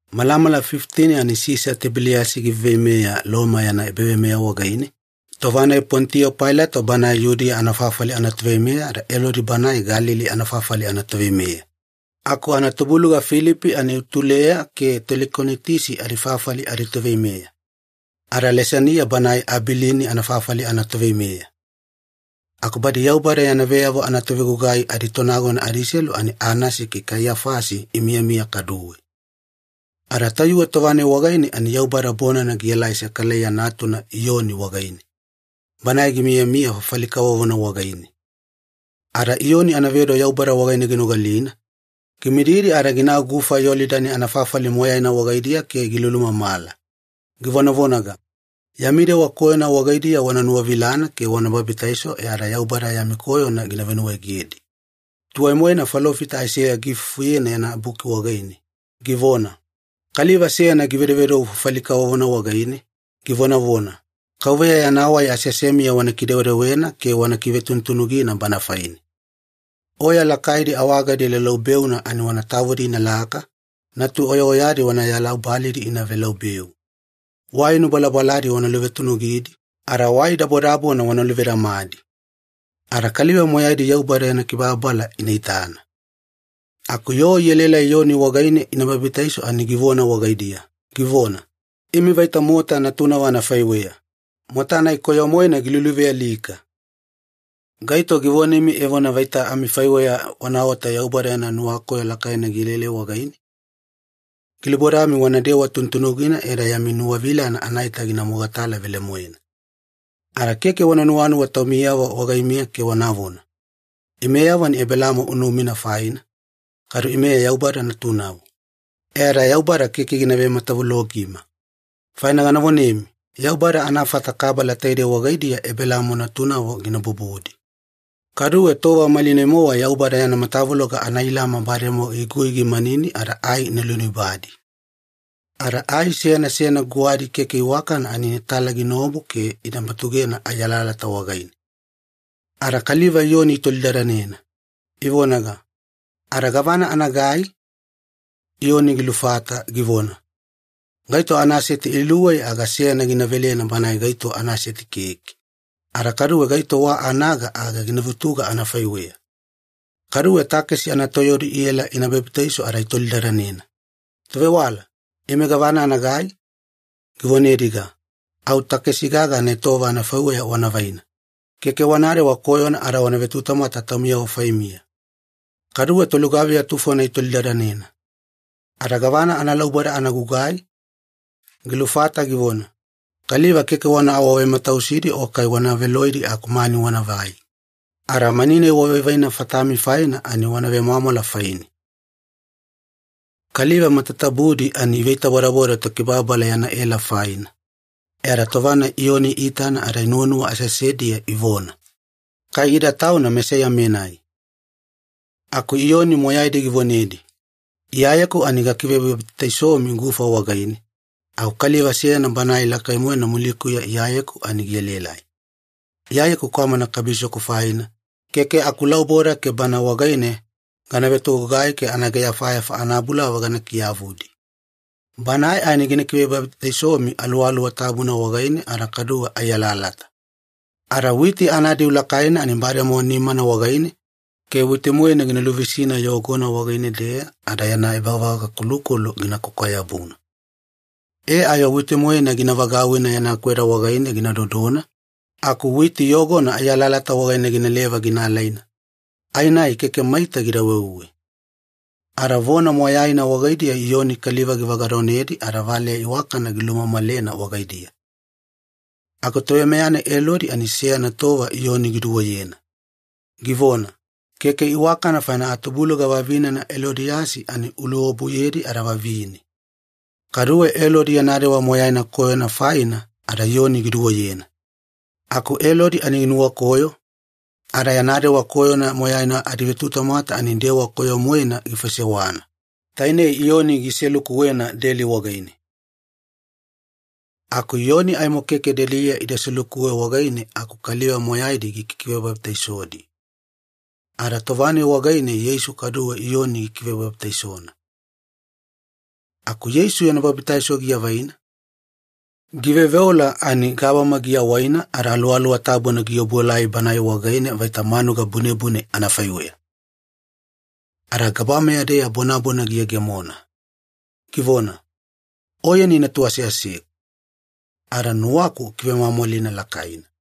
Malamala fifitini ani Sisa Tibeliyasi giveiveimeya Loma yana ebaveimeya wagaine, tova-nai Ponitiyo Pailato banae Yudiya anafafali anatoveimeya ada Elodi banae Galili anafafali anatoveimeya, aku anatubuluga Filipi ani Ituleya ke Telikonitisi adifafali aditoveimeya, ada Lisaniya banae Abilini anafafali anatoveimeya. Aku badi Yaubada yana veyavo anatovegugai aditonagona adiselu ani Anasi ke Kaiyafasi imiyamiya kaduwe. Ada tayuwe tova-nai wagaine ani Yaubada bonana gielai Sekalaiya natuna Iyoni wagaine, banae gimiyamiya fafali kavovona wagaine. Ada Iyoni anavedo Yaubada wagaine ginogalina, gimididi ada ginau Gufa Yolidani anafafali moyaina wagaidiya ke gilulumamala, givonavonaga, “Yami dewa koyona wagaidiya wana nuwavilana ke wana babitaiso e ada Yaubada yami koyona gina venuwaegedi.” Tuwai-moena falofita Aiseya giifufuyena yana buki wagaine, givona, “Kaliva seyana givedovedou fafali kavovona wagaine, givonavona, ‘KAUVEYA yana wai aseasemiya wana kidewedewena ke wana kivetunutunugina Bana faine. Oya lakaidi awagadi laulaubeuna ani wana tavudi inalaka, natu-oyaoyadi wanayala ubalidi ina velaubeu. Wai nubalabaladi wana luvetunugidi, ada wai dabodabona wana luvedamadi. Ada kaliva moyaidi Yaubada yana kibababala ina itana.’” Aku yoo ielaelai Iyoni wagaine ina babitaiso ani givona wagaidiya, givona, “Imi vaita mota natunavo anafaiweya, mota-nai koyo-moena giluluvealika! Gaito givonemi evona vaita amifaiweya wanaota Yaubada yana nuwakoyo lakaina gielaelai wagaine? Gilubodami wanadewa tunutunugina e ada yami nuwavilana anaita gina mogatala velemoena. Ada keke wana nuwanuwa taumiyavo wagaimiya ke wanavona, ‘Imeyavo ani Ebelaamo unumina faina, kadu ime Yaubada natunavo. E ada Yaubada keke gina vematavulogima.’ Faina gana vonemi, Yaubada anafata kabala taidei wagaidiya Ebelaamo natunavo gina bubudi. Kaduwe tova malinai-mowa Yaubada yana matavuloga anailama bademowa igui gimanini ada ai ina luinubadi. Ada ai seyana seyana guwadi keke iwakana ani inatala ginaobu ke ina batugena ai alalata wagaine.” Ada kaliva Iyoni itolidadanena, ivonaga, “Ada gavana anagai?” Iyoni gilufata, givona, “Gaito anaseti iluwei aga seyana gina velena banae gaito anaseti keke, ada kaduwe gaito wa anaga aga gina vutuga anafaiweya.” Kaduwe takesi anatoyaudi iela ina babitaiso ada itolidadanena, “Tovewala, ime gavana anagai?” Givonediga, “Au takesi gaga anaetowava anafaiweya wana vaina, keke wanadewa koyona ada wana vetutamwata taumiyavo faimiya.” Kaduwe tolugaviya tufona itolidadanena, “Ada gavana analauboda ana gugai?” Gilufata, givona, “Kaliva keke wana awavematausidi o kai wana veloidi aku mani wanavai. Ada mani-nai wavaivaina fatami faina ani wana vemwamwala faine.” Kaliva matatabudi ani iveitabodaboda Tokibababala yana ela faina, e ada tova-nai Iyoni iitana ada inuwanuwa aseasediya ivona, “Kai ida Tauna Mesaiya-menai.” Aku Iyoni moyaidi givonedi, “Iyayeku ani gakivebabitaisomi gufa wagaine, aku kaliva seyana Banae lakai-moena muliya Iyayeku ani gielaelai. Iya kwamana kabisoku faina, keke akulauboda ke Bana wagaine gana vetogugai ke anaageyafayafa anabulava gana kiyavudi. Banae ani gina kivebabitaisomi Aluwaluwa Tabuna wagaine ada kadu ai alalata. Ada witi anadiu lakaina ani bademowa nimana wagaine ke witi-moena gina luvisina yogona wagaine-deya ada yana ebavagakolukolu gina kwakwa-yabuna. E ayo witi-moena gina vagauwina yana kweda wagaine gina dodona, aku witi yogona ai alalata wagaine ginaleva gina alaina, ai-nai keke maita gida weuwe.” Ada vona moyaina wagaidiya Iyoni kaliva givagadonedi ada valeya iwakana gilumamalena wagaidiya. Aku toveimeya-nai Elodi ani seyana tova Iyoni giduweyena, givona, “Keke iwakana faina atubuluga vavinena Elodiyasi ani uluobuyedi ada vavine.” Kaduwe Elodi yana dewa moyaina koyona faina ada Iyoni giduweyena. Aku Elodi ani ginuwakoyo, ada yana dewa koyona moyaina adivetutamwata ani dewa koyo-moena gifaisewana, tainei Iyoni giselukuwena deli wagaine. Aku Iyoni aimo keke deliya ida selukuwe wagaine aku kaliva moyaidi gikikivebabitaisodi, ada tova-nai wagaine Yeisu kaduwe Iyoni gikivebabitaisona. Aku Yeisu yana babitaiso giavaina, giveoveola ani gabama giawaina ada Aluwaluwa Tabuna giobuelai Banae wagaine vaita manuga bunebune anafaiweya. Ada gabameya-deya bonabona giyegemona, givona, “Oyeni Natu aseaseku, ada nuwaku ukivemwamwalina lakaina.”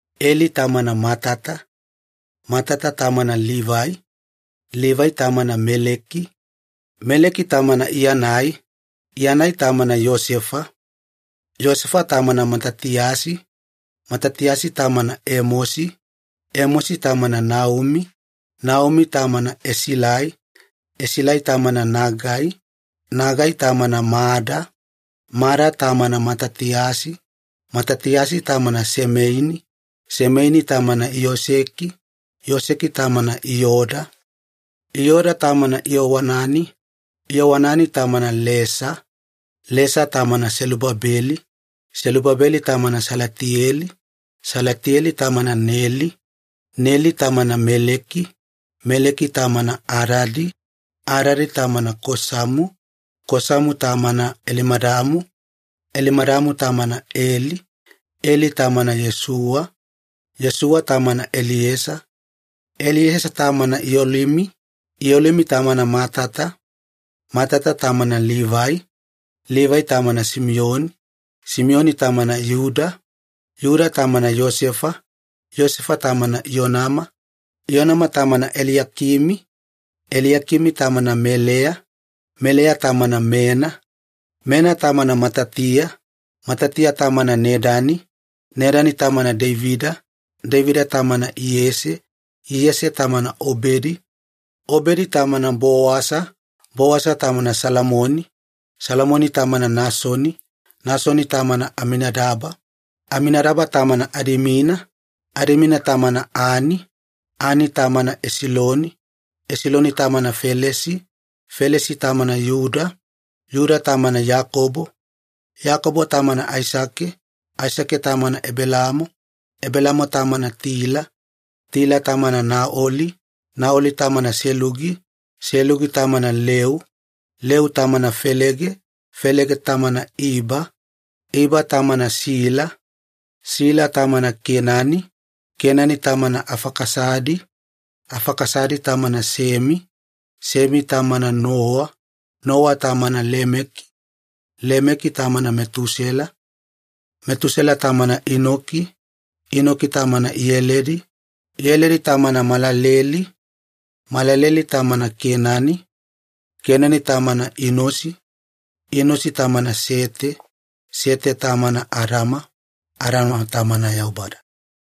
Eli tamana Matata, Matata tamana Livai, Livai tamana Meleki, Meleki tamana Iyanai, Iyanai tamana Iyosefa, Iyosefa tamana Matatiyasi, Matatiyasi tamana Emosi, Emosi tamana Naumi, Naumi tamana Esilai, Esilai tamana Nagai, Nagai tamana Mada, Mada tamana Matatiyasi, Matatiyasi tamana Semeini, Semeini tamana Iyoseki, Iyoseki tamana Iyoda, Iyoda tamana Iyowanani, Iyowanani tamana Lesa, Lesa tamana Selubabeli, Selubabeli tamana Salatiyeli, Salatiyeli tamana Neli, Neli tamana Meleki, Meleki tamana Adadi, Adadi tamana Kosamu, Kosamu tamana Elimadamu, Elimadamu tamana Ele, Ele tamana Iyosuwa, Iyosuwa tamana Eliesa, Eliesa tamana Iyolimi, Iyolimi tamana Matata, Matata tamana Livai, Livai tamana Simiyoni, Simiyoni tamana Iyuda, Iyuda tamana Iyosefa, Iyosefa tamana Iyonama, Iyonama tamana Eliyakimi, Eliyakimi tamana Meleya, Meleya tamana Mena, Mena tamana Matatia, Matatia tamana Nedani, Nedani tamana Deivida, Deivida tamana Iyese, Iyese tamana Obedi, Obedi tamana Bowasa, Bowasa tamana Salamoni, Salamoni tamana Nasoni, Nasoni tamana Aminadaba, Aminadaba tamana Adimina, Adimina tamana Ani, Ani tamana Esiloni, Esiloni tamana Felesi, Felesi tamana Iyuda, Iyuda tamana Iyakobo, Iyakobo tamana Aisake, Aisake tamana Ebelaamo, Ebelaamo tamana Tila, Tila tamana Naoli, Naoli tamana Selugi, Selugi tamana Leu, Leu tamana Felege, Felege tamana Iba, Iba tamana Sila, Sila tamana Keinane, Keinane tamana Afakasadi, Afakasadi tamana Semi, Semi tamana Nowa, Nowa tamana Lemeki, Lemeki tamana Metusela, Metusela tamana Inoki, Inoki tamana Iyeledi, Iyeledi tamana Maalaleli, Maalaleli tamana Keinani, Keinani tamana Inosi, Inosi tamana Sete, Sete tamana Adama, Adama tamana Yaubada.